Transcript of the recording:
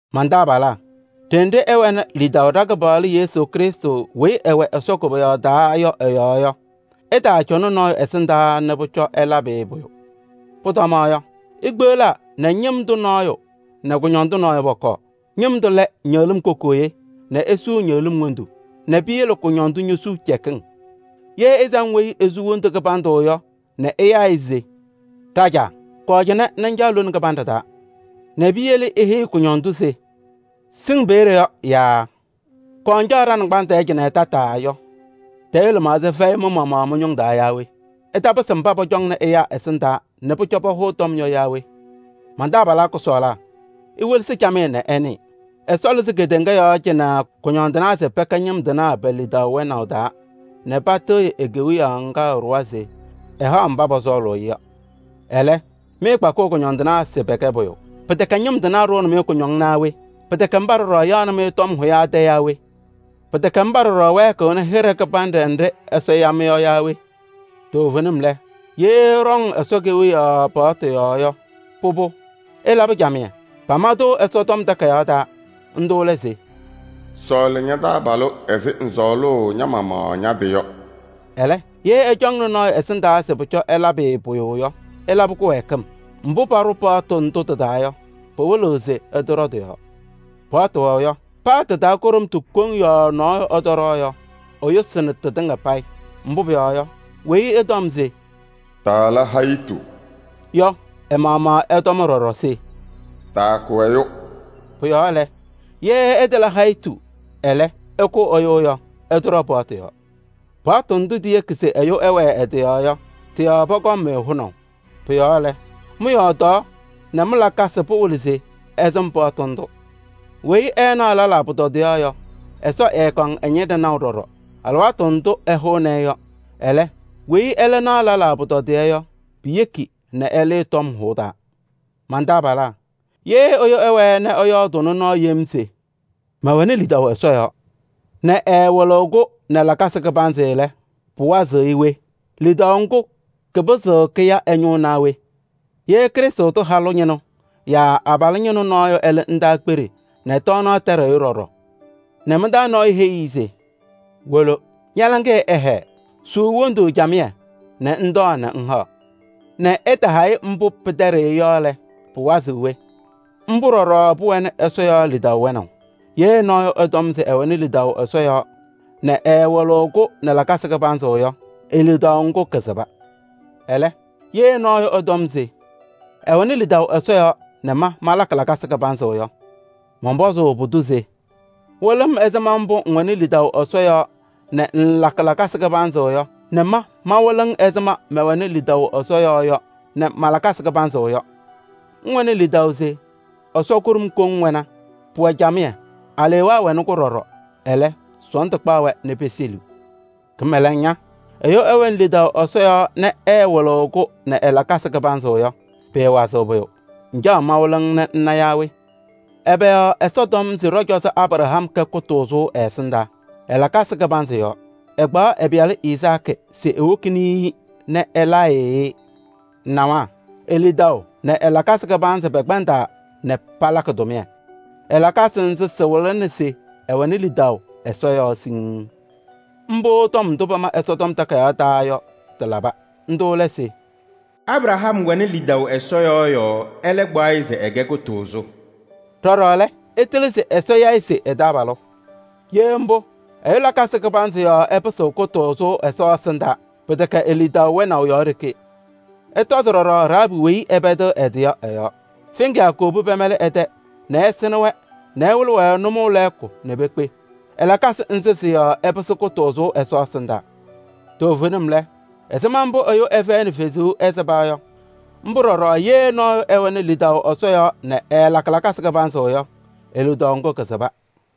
Man-taabalaa! Đenɖe ɩwɛnɩ lidaʋ ɖa-Kɩpaɣlʋ Yesu Krɩstʋ weyi ɛwɛ Ɛsɔ koboyaɣ taa yɔ ɛ-yɔɔ yɔ, ɩtaacɔnɩ nɔɔyʋ ɛsɩndaa nɛ pʋcɔ ɩlabɩ-ɩ pʋyʋ. Pʋtɔma yɔ, ikpeɣlaa nɛ ñɩm tʋ nɔɔyʋ nɛ kʋñɔndʋ nɔɔyʋ pɔkɔɔ. Ñɩm tʋ lɛ ñɩɣlɩ́m kokooye nɛ esuu ñɩɣlɩ́m wondu nɛ piyele kʋñɔndʋ ñosuu cɛkɩŋ. Yee ɩsam weyi esu wondu kɩbandʋ yɔ nɛ ɩyaa-ɩ se: “Đajaa! Kɔɔ cɩnɛ nɛ ŋcaɣ lone kɩbanɖɛ taa” nɛ piyele iheyi kʋñɔndʋ se: “Sɩŋ peeɖe yɔ” yaa: “Kɔɔ ŋcaɣ ɖa-naŋgbanzɩ tɛɛ cɩnɛ tataa” yɔ, tayʋʋ lɩmaɣza fɛyɩ mɩ-maɣmaɣ mɩ-ñʋŋ taa yaa we? Ɩtapɩsɩ mbá pɔcɔŋnɩ ɛyáa ɛsɩndaa nɛ pʋcɔ pahʋʋ tɔm yɔ yaa we? Man-taabalaa kʋsɔɔlaa! Iwelesi camɩyɛ nɛ ɩnɩɩ: Ɛsɔ lɩzɩ kedeŋa yɔɔ cɩnɛ kʋñɔndɩnaa se pɛkɛ ñɩm tɩnaa pe-lidaʋ wɛnaʋ taa nɛ patɩɣyɩ e-Kewiyaɣ ŋgá ɛɖʋwa se ɛhaɣ mbá pɔsɔɔlɩ-ɩ yɔ. Ɛlɛ́, mɩ mɩɩkpakɩɣ kʋñɔndɩnaa se pɛkɛ pʋyʋ! Pɩtɛkɛ ñɩm tɩnaa ɖʋʋnɩ-mɩ kʋñɔŋ naa we? Pɩtɛkɛ ḿbá ɖɔɖɔ yaɣnɩ-mɩ tɔm hʋyaa tɛ yaa we? Pɩtɛkɛ ḿbá ɖɔɖɔ wɛɛkɩɣnɩ hɩɖɛ kɩbanɖɛ nɖɩ́ Ɛsɔ ya-mɩ yɔ yaa we? Toovenim lɛ, yee ɩɖɔŋ Ɛsɔ Kewiyaɣ paɣtʋ yɔɔ yɔ, pʋbʋ, ɩlabɩ camɩyɛ. Pama-tʋ Ɛsɔtɔm Takayaɣ taa, ńdʋ́ lɛ se: “Sɔɔlɩ ña-taabalʋ ɛzɩ ŋsɔɔlʋʋ ña-maɣmaɣ ña-tɩ yɔ.” Ɛlɛ́, yee ɩcɔŋnɩ nɔɔyʋ ɛsɩndaa se pʋcɔ ɩlabɩ-ɩ pʋyʋ yɔ, ɩlabɩ kɩwɛɛkɩm. Mbʋ́ paɖʋ paɣtʋ ńdʋ́ tɩ-taa yɔ, pɩwɩlɩɣ se ɩtɔɖɔ tɩ-yɔɔ. Paɣtʋ wɛʋ yɔ, paa tɩ-taa kʋɖʋmtʋ koŋ yɔɔ nɔɔyʋ ɛtɔɖɔ yɔ, ɛyʋsɩnɩ tɩtɩŋa payɩ. Mbʋ́ pʋyɔɔ yɔ, weyi ɛtɔm se: “Taala hayitu” yɔ, ɛ-maɣmaɣ ɛtɔmna ɖɔɖɔ se: “Taakʋ ɛyʋ.” Pʋ-yɔɔ lɛ, yee ɩtala hayitu, ɛlɛ́, ɩkʋ ɛyʋ yɔ, ɩtɔɖɔ paɣtʋ yɔɔ. Paɣtʋ ndʋ́ tiyeki se ɛyʋ ɛwɛɛ ɛ-tɩ yɔɔ yɔ, tɩ-yɔɔ pɔkɔŋ-mɩ hʋnaʋ. Pʋ-yɔɔ lɛ, mɩ-yɔɔdaɣ nɛ mɩ-lakasɩ pawɩlɩ se ɩsɩm paɣtʋ ńdʋ́. Weyi ɛɛnaɣ lɛlaa pʋtɔdɩyɛ yɔ, Ɛsɔ ɛɛkɔŋ ɛ-ñɩnɖɛ naʋ ɖɔɖɔ alɩwaatʋ ndʋ́ ɛhʋʋnɩ-ɩ yɔ. Ɛlɛ́, weyi ɛ́lɛ́ naɣ lɛlaa pʋtɔdɩyɛ yɔ, piyeki nɛ ɛlɩɩ tɔm hʋʋ taa. Man-taabalaa! Yee ɛyʋ ɛwɛɛ nɛ ɛyɔɔdʋʋnɩ nɔɔ yem se: “Mɛwɛnɩ lidaʋ Ɛsɔ yɔɔ” nɛ ɛɛwɩlɩɣ-kʋ nɛ lakasɩ kɩbanzɩ lɛ, pɩwazɩɣ-ɩ we? Lidaʋ ŋ́gʋ́ kɩpɩzɩɣ kɩya ɛ-ñʋʋ naa we? Yee Krɩstʋ tʋ halʋ ñɩnʋ yaa abalʋ ñɩnʋ nɔɔyʋ ɛlɩɣ ndaakpeɖe nɛ tɔɔnaɣ tɛɖɩɣ-ɩ ɖɔɖɔ nɛ mɩ-taa nɔɔyʋ heyi-i se: “Wolo, ña-laŋɩyɛ ɛhɛɛ, suu wondu camɩyɛ nɛ ŋtɔɔ nɛ ŋhaɣ!” Nɛ ɛtaha-ɩ mbʋ́ pɩtɛɖɩɣ-ɩ yɔ lɛ, pɩwazɩɣ we? Ḿbʋ́ ɖɔɖɔ pʋwɛnɩ Ɛsɔ yɔɔ lidaʋ wɛnaʋ: yee nɔɔyʋ ɛtɔm se ɛwɛnɩ lidaʋ Ɛsɔ yɔɔ nɛ ɛɛwɩlɩɣ-kʋ nɛ lakasɩ kɩbanzɩ yɔ, e-lidaʋ ŋ́gʋ́ kɩsɩba. Ɛlɛ́, yee nɔɔyʋ ɛtɔm se: “ɛwɛnɩ lidaʋ Ɛsɔ yɔɔ nɛ ma malakɩ lakasɩ kɩbanzɩ yɔ” mɔnpɔzʋʋ pʋdʋ se: “Wɩlɩ-m ɛzɩma mbʋ́ ŋwɛnɩ lidaʋ Ɛsɔ yɔɔ nɛ ŋŋlakɩ lakasɩ kɩbanzɩ yɔ nɛ ma mawɩlɩ-ŋ ɛzɩma mbʋ́ mɛwɛnɩ lidaʋ ɛ-yɔɔ yɔ nɛ ma-lakasɩ kɩbanzɩ yɔ.” Ŋwɛnɩ lidaʋ se Ɛsɔ kʋɖʋm koŋ wɛna, pʋwɛ camɩyɛ. Aleewaa ñɛwɛnɩ-kʋ ɖɔɖɔ, ɛlɛ́ sɔɔndʋ kpaɣ-wɛ nɛ peseliɣ. Kɩmɛlɛŋ ña! Ɛyʋ ɛwɛnɩ lidaʋ Ɛsɔ yɔɔ nɛ ɛɛwɩlɩɣ-kʋ nɛ ɛ-lakasɩ kɩbanzɩ yɔ, pɩɩwazɩɣ pʋyʋ. Ŋcaɣ mawɩlɩ-ŋ nɛ ŋna yaa we? Ɛbɛ yɔɔ Ɛsɔ tɔm se ɖɔ-cɔzɔ Abraham kɛ kʋtʋʋzʋ ɛ-ɛsɩndaa? Ɛ-lakasɩ kɩbanzɩ yɔɔ: ɛkpaɣ ɛ-pɩyalʋ Izaakɩ se ewokini-i nɛ ɛlaa-ɩ-ɩ. Ŋnawa: e-lidaʋ nɛ ɛ-lakasɩ kɩbanzɩ pɛkpɛndaa nɛ palakɩ tʋmɩyɛ. Ɛ-lakasɩ ńzɩ́ sɩwɩlɩnɩ se ɛwɛnɩ lidaʋ Ɛsɔ yɔɔ siŋŋ. Ḿbʋ́ tɔm ndʋ́ pama Ɛsɔtɔm Takayaɣ taa yɔ, tɩlaba. Ńdʋ́ lɛ se: “Abraham wɛnɩ lidaʋ Ɛsɔ yɔɔ yɔɔ, ɛ́lɛ́ kpaɣ-ɩ se ɛkɛ kʋtʋʋzʋ.” Đɔɖɔ lɛ, ɩtɩlɩ se Ɛsɔ ya-ɩ se ɛ-taabalʋ. Yee ḿbʋ́, ɛyʋ lakasɩ kɩbanzɩ yɔɔ ɛpɩsɩɣ kʋtʋʋzʋ Ɛsɔ ɛsɩndaa, pɩtɛkɛ e-lidaʋ wɛnaʋ yɔɔ ɖeke. Ɩtɔzɩ ɖɔɖɔ Rahaabɩ weyi ɛpɛdɩɣ ɛ-tɩ yɔ ɛ-yɔɔ. Feŋiyaa kowobi pɛmɛlɩ ɛ-tɛ nɛ ɛsɩnɩ-wɛ nɛ ɛwɩlɩ-wɛ nʋmɔʋ lɛɛkʋ nɛ pekpe. Ɛ-lakasɩ ńzɩ́ sɩ-yɔɔ ɛpɩsɩ kʋtʋʋzʋ Ɛsɔ ɛsɩndaa. Toovenim lɛ, ɛzɩma mbʋ́ ɛyʋ ɛfɛyɩnɩ fezuu, ɛsɩba yɔ, ḿbʋ́ ɖɔɖɔ yee nɔɔyʋ ɛwɛnɩ lidaʋ Ɛsɔ yɔɔ nɛ ɛɛlakɩ lakasɩ kɩbanzɩ yɔ, e-lidaʋ ŋ́gʋ́ kɩsɩba.